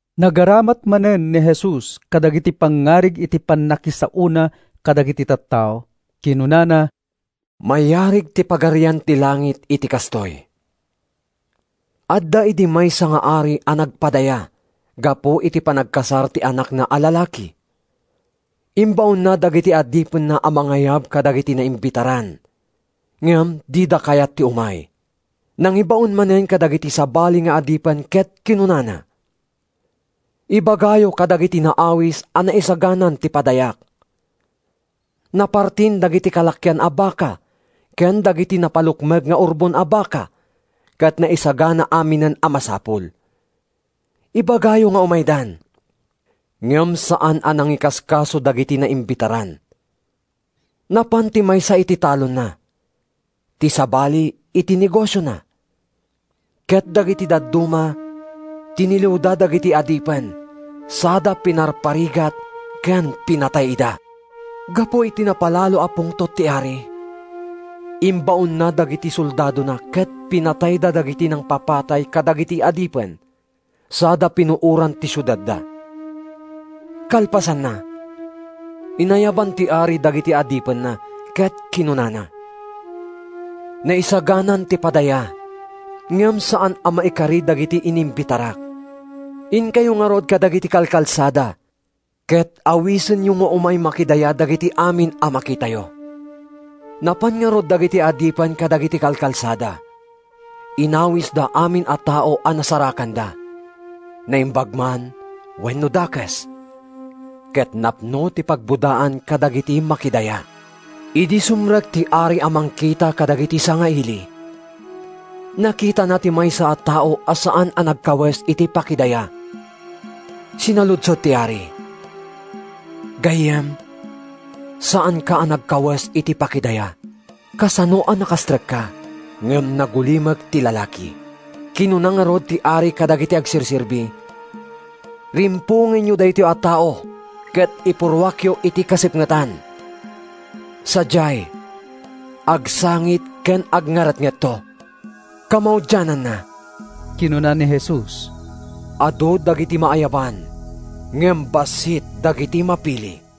Nagaramat manen ni Jesus kadagiti pangngarig iti pannakisaona kadagiti tattao. Kinunana, “Mayarig ti Pagarian ti Langit iti kastoy: Adda idi maysa nga ari a nagpadaya gapu iti panagkasar ti anakna a lalaki. Imbaonna dagiti adipenna a mangayab kadagiti naimbitaran, ngem dida kayat ti umay. Nangibaon manen kadagiti sabali nga adipen ket kinunana: ‘Ibagayo kadagiti naawis a naisaganan ti padayak. Napartin dagiti kalakian a baka ken dagiti napalukmeg nga urbon a baka ket naisagana aminen a masapul. Ibagayo nga umaydan.’ “Ngem saan a nangikaskaso dagiti naimbitaran: napan ti maysa iti talonna, ti sabali iti negosiona; ket dagiti dadduma tiniliwda dagiti adipen sada pinarparigat ken pinatay ida. “Gapu iti napalalo a pungtot ti ari, imbaonna dagiti soldadona ket pinatayda dagiti nangpapatay kadagiti adipen sada pinuoran ti siudadda. “Kalpasanna, inayaban ti ari dagiti adipenna ket kinunana, ‘Naisaganan ti padaya, ngem saan a maikari dagiti inimbitarak. Inkayo ngarud kadagiti kalkalsada ket awisenyo nga umay makidaya dagiti amin a makitayo’. “Napan ngarud dagiti adipen kadagiti kalkalsada. Inawisda amin a tao a nasarakanda, naimbag man wenno dakes, ket napno ti pagbodaan kadagiti makidaya. “Idi sumrek ti ari a mangkita kadagiti sangaili, nakitana ti maysa a tao a saan a nagkawes iti pakidaya. Sinaludsod ti ari, ‘Gayyem, saanka a nagkawes iti pakidaya. Kasano a nakastrekka?’ “Ngem nagulimek ti lalaki. “Kinuna ngarud ti ari kadagiti agserserbi, ‘Rimpongenyo daytoy a tao ket ipurruakyo iti kasipngetan. Sadiay, agsangit ken agngaretngetto.’” Kamaudiananna, kinuna ni Jesus, “Adu dagiti maayaban ngem bassit dagiti mapili.”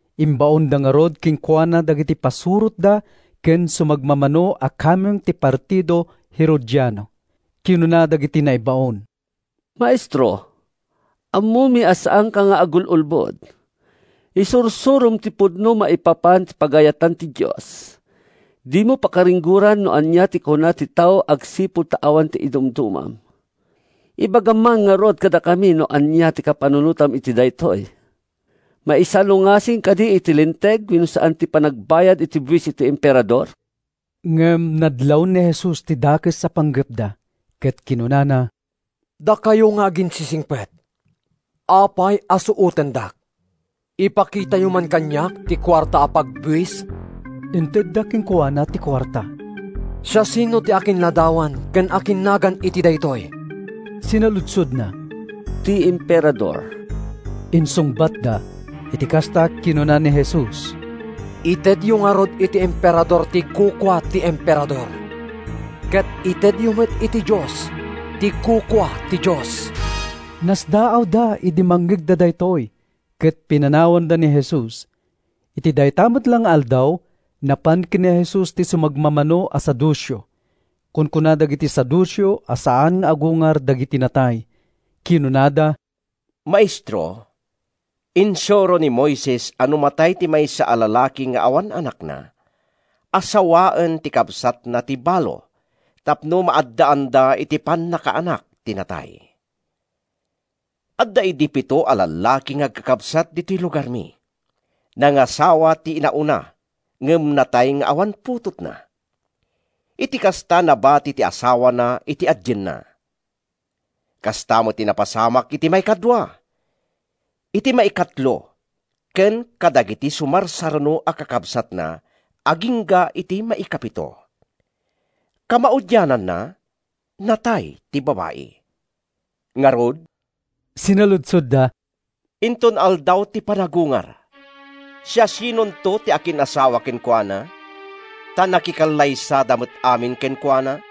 Imbaonda ngarud kenkuana dagiti pasurotda ken sumagmamano a kameng ti partido Herodiano. Kinuna dagiti naibaon, “Maestro, ammomi a saanka nga agul-ulbod. Isursurom ti pudno maipapan iti pagayatan ti Dios. Dimo pakaringgoran no ania ti kuna ti tao agsipud ta awan idumdumam. Ibagam man ngarud kadakami no ania ti kapanunotam iti daytoy? Maisalungasing kadi iti Linteg wenno saan ti panagbayad iti buis iti Emperador?” Ngem nadlaw ni Jesus ti dakes a panggepda, ket kinunana, “Dakayo nga aginsisingpet! Apay a suotendak? Ipakitayo man kaniak ti kuarta a pagbuis!” Intedda kenkuana ti kuarta. “Siasino ti akinladawan ken akinnagan iti daytoy?” sinaludsodna. “Ti Emperador,” insungbatda. Iti kasta, kinuna ni Jesus, “Itedyo ngarud iti Emperador ti kukua ti Emperador, ket itedyo met iti Dios ti kukua ti Dios.” Nasdaawda idi mangngegda daytoy, ket pinanawanda ni Jesus. Iti dayta met la nga aldaw, napan ken ni Jesus ti sumagmamano a Saduceo. (Kunkuna dagiti Saduceo a saan nga agungar dagiti natay.) Kinunada, “Maestro, insuro ni Moises a no matay ti maysa a lalaki nga awan anakna, asawaen ti kabsatna ti balo tapno maaddaanda iti pannakaanak ti natay. Adda idi pito a lallaki nga agkakabsat ditoy lugarmi. Nangasawa ti inauna ngem natay nga awan putotna. Iti kasta, nabati ti asawana iti adienna. Kasta met ti napasamak iti maikadua, iti maikatlo ken kadagiti sumarsaruno a kakabsatna agingga iti maikapito. Kamaudiananna, natay ti babai. “Ngarud,” sinaludsodda, “inton aldaw ti panagungar, siasinonto ti akin-asawa kenkuana? Ta nakikallaysada met amin kenkuana!”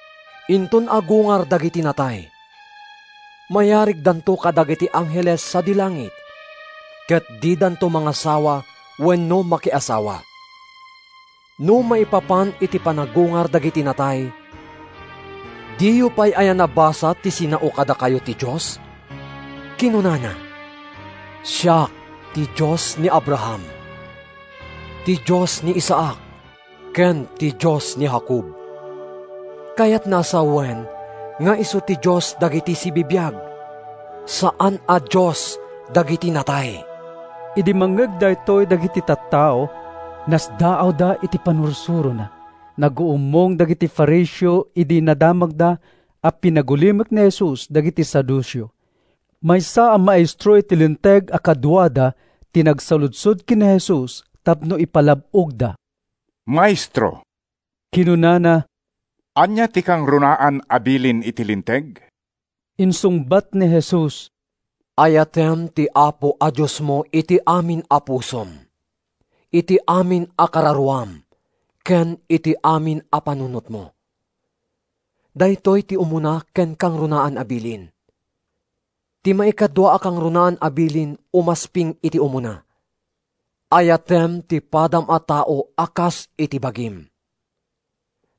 Inton agungar dagiti natay, mayarigdanto kadagiti angheles sadi langit, ket didanto mangasawa wenno makiasawa. No, maipapan iti panagungar dagiti natay, diyo pay aya nabasa ti sinao kadakayo ti Dios? Kinunana, ‘Siak ti Dios ni Abraham, ti Dios ni Isaac ken ti Dios ni Jacob.’ Kayatna a sawen nga isu ti Dios dagiti sibibiag, saan a Dios dagiti natay.” Idi mangngeg daytoy dagiti tattao, nasdaawda iti pannursurona. Naguummong dagiti Fariseo idi nadamagda a pinagulimek ni Jesus dagiti Saduceo. Maysa a maestro iti Linteg a kaduada ti nagsaludsod ken ni Jesus tapno ipalab-ogda. “Maestro,” kinunana, “ania ti kangrunaan a bilin iti Linteg?” Insungbat ni Jesus, “ ‘Ayatem ti Apo a Diosmo iti amin a pusom, iti amin a kararuam, ken iti amin a panunotmo.’ Daytoy ti umuna ken kangrunaan a bilin. Ti maikadua a kangrunaan a bilin umasping iti umuna, ‘Ayatem ti padam a tao a kas iti bagim.’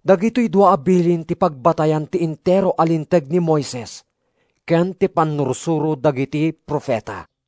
Dagitoy dua a bilin ti pagbatayan ti entero a Linteg ni Moises ken ti pannursuro dagiti profeta.”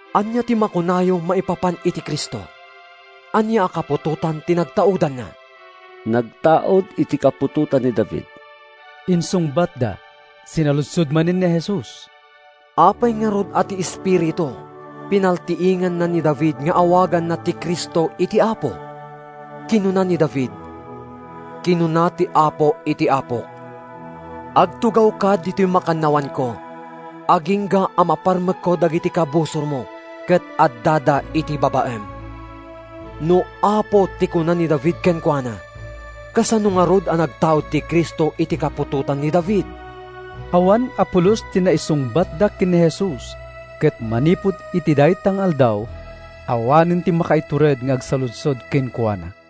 “Ania ti makunayo maipapan iti Cristo? Ania a kaputotan ti nagtaudanna?” “Nagtaud iti kaputotan ni David,” insungbatda. Sinaludsod manen ni Jesus, “Apay ngarud a ti Espiritu pinaltiinganna ni David nga awaganna ti Cristo iti ‘Apo’? Kinuna ni David, ‘Kinuna ti Apo iti Apok: Agtugawka ditoy makannawanko, Agingga a maparmekko dagiti kabusormo ket addada iti babaem.’ No ‘Apo’ ti kuna ni David kenkuana, kasano ngarud a nagtaud ti Cristo iti kaputotan ni David?” Awan a pulos ti naisungbatda ken ni Jesus, ket manipud iti dayta nga aldaw, awanen ti makaitured nga agsaludsod kenkuana.